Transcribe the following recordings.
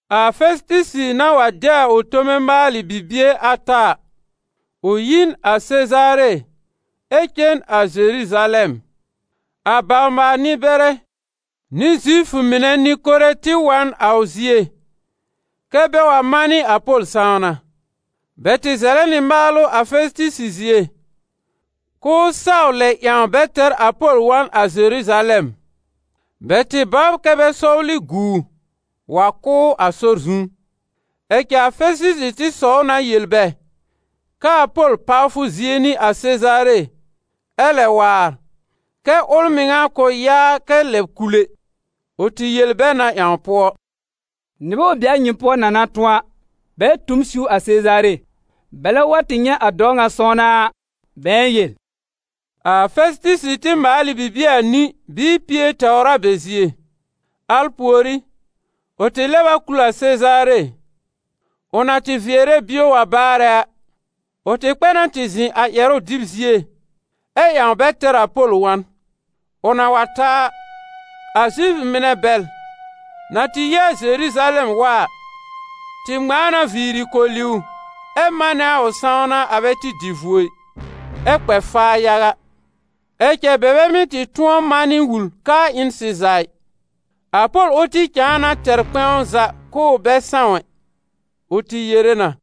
A Fɛsɩtɩsɩ na wa de a ʋ tome maalɩ bibie ata a, ʋ yi n a Sezaare ɛ cen a Zeruzalɛm. A bawr-maal-nɩ-bɛrɛ nɩ Zifʋ mɩnɛ nɩ-kore tɩ wa n a ʋ zie kɛ́ bɛ wa manɩ a Pol sãwna. Bɛ tɩ zɛlɛ nɩ maalʋ a Fɛsɩtɩsɩ zie, k'ʋʋ saw lɛb ƴãw bɛ tɛr a Pol wa n a Zeruzalɛm. Bɛ tɩ bɔbr kɛ bɛ sɔwlɩ gu ʋ, wa kʋ́ ʋ a sɔr zu. Ɛ cɛ a Fɛsɩtɩsɩ tɩ sɔw na yel bɛ kɛ a Pol pawfʋ zie n'ɩ a Sezaare, ɛ lɛ waar, kɛ ʋl mɩŋa kʋ̃ yaa kɛ lɛb kul ɛ. Ʋ tɩ yel bɛ na ƴãw pʋɔ: «Nɩbɛ wa be a nyɩ pʋɔ na na tʋ̃ɔ a, bɛ tu m siw a Sezaare bɛlɛ wa tɩ nyɛ̃ a dɔɔ ŋa sãwna a, bɛ̃ɛ yel.» A Fɛsɩtɩsɩ tɩ maal ɩ bibie anĩ bɩɩ pie tɛwr a bɛ zie. Al pùorí, ʋ tɩ lɛb a kul a Sezaare. Ʋ na tɩ vɩɛrɛ bio wa baarɛ a, ʋ tɩ kpɛ na tɩ zɩ̃ a ƴɛrʋ dɩb zie ɛ ƴãw bɛ tɛr a Pol wa n. Ʋ na wa ta a, a Zifʋ mɩnɛ bɛl, na tɩ yi a Zeruzalɛm wa a, tɩ ŋmãa na viiri koli ʋ ɛ manɛ a ʋ sãwna a bɛ tɩ dɩ vuo ɩ, ɛ kpɛ faa yaga. Ɛ cɛ bɛ bɛ mɩ́ tɩ tʋ̃ɔ manɩ wul k'aa ɩ n sɩza ɩ. A Pol ʋl tɩ cãa na tɛr kpɛ̃w za k'ʋʋ bɛ sãw ɛ. Ʋ tɩ yere na: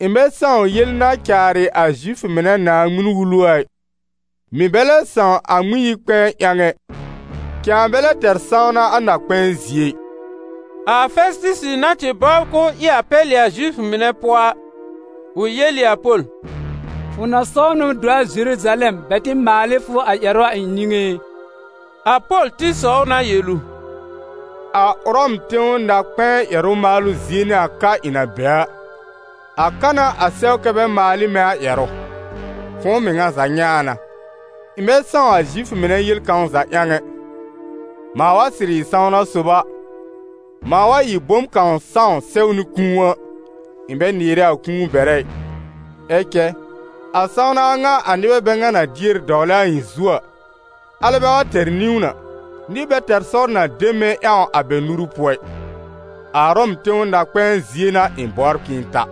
«Ɩ̃ bɛ sãw yel na caarɩ a Zifʋ mɩnɛ Naaŋmɩn-Wulu a ɩ, mɩ̀ bɛ lɛ sãw a Ŋmɩn-yi-kpɛ̃ɛ ƴãw ɛ, cãa bɛ lɛ tɛr sãwna a na-kpɛ̃ɛ zie ɩ.» A Fɛsɩtɩsɩ na tɩ bɔbr k'ʋʋ ɩ a pɛlɩ a Zifʋ mɩnɛ pʋɔ a, ʋ yel ɩ a Pol: «Fʋ na saw na do a Zeruzalɛm bɛ tɩ maal ɩ fʋ a ƴɛrʋ a ɩ̃ niŋé e?» A Pol tɩ sɔw na yel ʋ: «A Ʋrɔm tẽw na-kpɛ̃ɛ ƴɛrʋ maalʋ zie n'ɩ a ka ɩ̃ na be a, a ka n'a a sɛw kɛ́ bɛ maal ɩ mɛ̃ a ƴɛrʋ. Fʋ̃ʋ mɩŋa za nyɛ̃ a na, ɩ̃ bɛ sãw a Zifʋ mɩnɛ yel kãw za ƴãw ɛ. Mãa wa sɩrɩ ɩ sãwna sob a, mãa wa ɩ bom kãw sãw sɛwnɩ kũu a, ɩ̃ bɛ nɩɩrɛ a kũu bɛrɛ ɩ. Ɛ cɛ, a sãwna a ŋa a nɩbɛ bɛ ŋa na dier dɔwlɛ a ɩ̃ zu a, alɛ bɛ wa tɛr niwn a, nɩr bɛ tɛr sɔr na de mɛ̃ ƴãw a bɛ nuru pʋɔ ɩ. A Ʋrɔm tẽw na-kpɛ̃ɛ zie n'a ɩ̃ bɔbr k'ɩ̃ɩ ta.»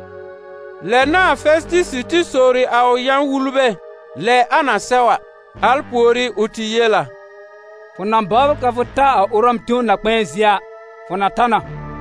Lɛ n'a a Fɛsɩtɩsɩ tɩ sowri a ʋ yã-wulbɛ lɛ a na sɛw a; al pùorí ʋ tɩ yel a: «Fʋ na bɔbr kɛ fʋ ta a Ʋrɔm tẽw na-kpɛ̃ɛ zie a, fʋ na ta na.»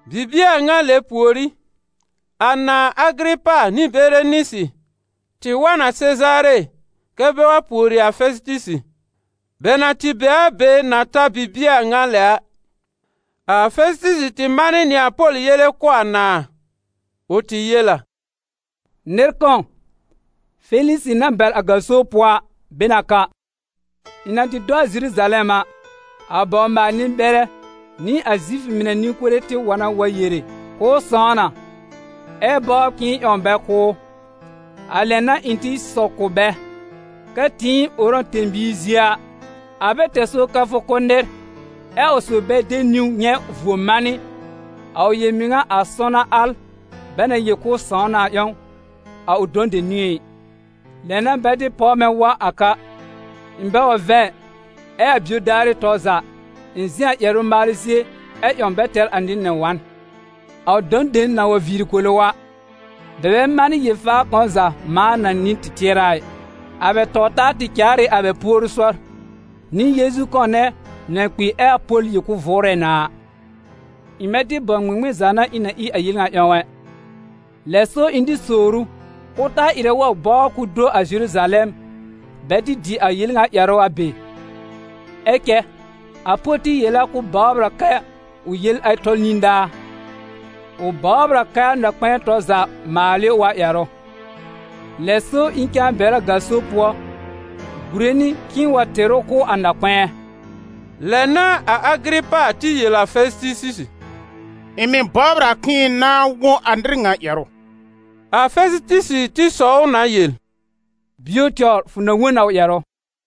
Bibie a ŋa lɛ pùorí, a nãà Agɩrɩpa nɩ Berenisɩ tɩ wa n a Sezaare kɛ́ bɛ wa pùori a Fɛsɩtɩsɩ. Bɛ na tɩ be a be na ta bibie a ŋa lɛ a, a Fɛsɩtɩsɩ tɩ manɩ nɩ a Pol yele kʋ̀ a nãà. Ʋ tɩ yel a: «Nɩr kãw, Felisɩ na bɛr a gaso pʋɔ a, be n a ka. Ɩ̃ na tɩ do a Zeruzalɛm a, a bawr-maal-nɩ-bɛrɛ nɩ a Zifʋ mɩnɛ nɩ-kore tɩ wa na wa yere k'ʋʋ sãw na, ɛ bɔbr k'ɩ̃ɩ ƴãw bɛ kʋ́ ʋ. A lɛ n'a ɩ̃ tɩ sɔw kʋ̀ bɛ kɛ tɩɩm Ʋrɔm tẽ-biir zie a, a bɛ tɛr sɔr kɛ fʋ kʋ́ nɩr, ɛ a ʋ sob bɛ de niwn nyɛ̃ vuo manɩ a ʋ yel-mɩŋa a sãwna al bɛ na yel k'ʋʋ sãw na a ƴãw, a ʋ dɔ̃ dem niŋé ɩ. Lɛ n'a bɛ tɩ páw mɛ̃ wa a ka, ɩ̃ bɛ wa vɛ̃ ɩ, ɛ a bio daarɩ tɔr za, ɩ̃ zɩ̃ a ƴɛrʋ maalʋ zie ɛ ƴãw bɛ tɛr a nɩr nɛ wa n. A ʋ dɔ̃ dem na wa viiri koli ʋ a, bɛ bɛ manɩ yel-faa kãw za mãa na nɩ̃ɛ tɩ tɩɛrɛ a ɩ. A bɛ taw-taa tɩ caar ɩ a bɛ puoru sɔr, nɩ Yeezu kãw nɛ na kpi ɛ a Pol yel k'ʋʋ vʋʋrɛ na a. Ɩ̃ bɛ tɩ bãw ŋmɩŋmɩn za n'a ɩ̃ na ɩ a yel ŋa ƴãw ɛ. Lɛ so ɩ̃ tɩ sowr ʋ k'ʋʋ taa ɩrɛ wa bɔbr k'ʋʋ do a Zeruzalɛm bɛ tɩ dɩ a yel ŋa ƴɛrʋ a be. Ɛ cɛ a Pol tɩ yel a k'ʋʋ bɔbr a kɛ a ʋ yele tɔl nidaa. Ʋ bɔbr a kɛ a na-kpɛ̃ɛ tɔr za maal ɩ ʋ a ƴɛrʋ. Lɛ so ɩ̃ cãa bɛr ʋ a gaso pʋɔ gùre nɩ k'ɩ̃ɩ wa tɩr ʋ kʋ̀ a na-kpɛ̃ɛ.» Lɛ n'a a Agɩrɩpa tɩ yel a Fɛsɩtɩsɩ: «Ɩ̃ mɩ̀ bɔbr a k'ɩ̃ɩ nãa wõ a nɩr ŋa ƴɛrʋ.» A Fɛsɩtɩsɩ tɩ sɔw ʋ na yel: «Bio tɛwr fʋ na wõ n a ʋ ƴɛrʋ.»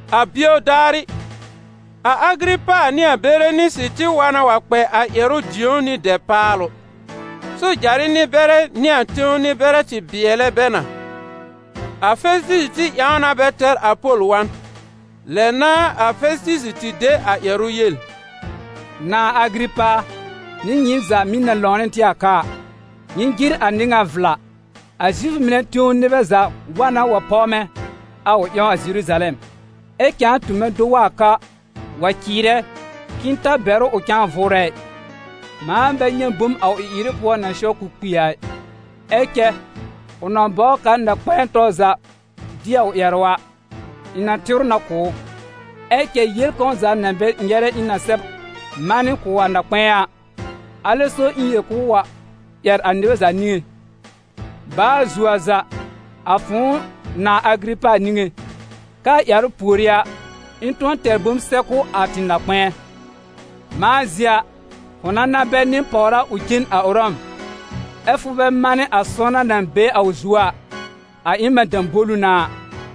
A bio daarɩ, a Agɩrɩpa nɩ a Berenisɩ tɩ wa na wa kpɛ a ƴɛrʋ dĩ̀ó nɩ dɛpaalʋ. Sojarɩ nɩ-bɛrɛ nɩ a tẽw nɩ-bɛrɛ tɩ bɩɛlɛ bɛ na. A Fɛsɩtɩsɩ tɩ ƴãw na bɛ tɛr a Pol wa n. Lɛ n'a a Fɛsɩtɩsɩ tɩ de a ƴɛrʋ yel: «Nãà Agɩrɩpa a, nɩ nyɩɩm za mɩ̀ na lãw nɩ tɩ a ka a, nyɩ jɩr a nɩr ŋa vla. A Zifʋ mɩnɛ tẽw nɩbɛ za wa na wa páw mɛ̃ a ʋ ƴãw a Zeruzalɛm, ɛ cãa tu mɛ̃ do wa a ka wa cɩɩrɛ k'ɩɩ ta bɛr ʋ ʋ cãa vʋʋrɛ ɩ. Mãa bɛ nyɛ̃ bom a ʋ ɩ-ɩrɩ pʋɔ na sɛw k'ʋʋ kpi a ɩ. Ɛ cɛ ʋ na bɔbr kɛ a na-kpɛ̃ɛ tɔr za dɩ a ʋ ƴɛrʋ a, ɩ̃ na tɩr ʋ na kʋ̀ ʋ. Ɛ cɛ yel kãw za na bɛ nyɛrɛ ɩ̃ na sɛb manɩ kʋ̀ a na-kpɛ̃ɛ a, alɛ so ɩ̃ yel k'ʋʋ wa ƴɛr a nyɩ za niŋé, baa zuo a za, a fʋ̃ʋ nãà Agɩrɩpa niŋé, kɛ́ a ƴɛrʋ pùorí a, ɩ̃ tʋ̃ɔ tɛr bom sɛb kʋ̀ a tɩ na-kpɛ̃ɛ. Mãa zie a, fʋ na na bɛr nɩ-pàwra ʋ cen a Ʋrɔm, ɛ́ fʋ bɛ manɩ a sãwna na be a ʋ zu a, a ɩ na mɛ̃ dãbolu n'a a.»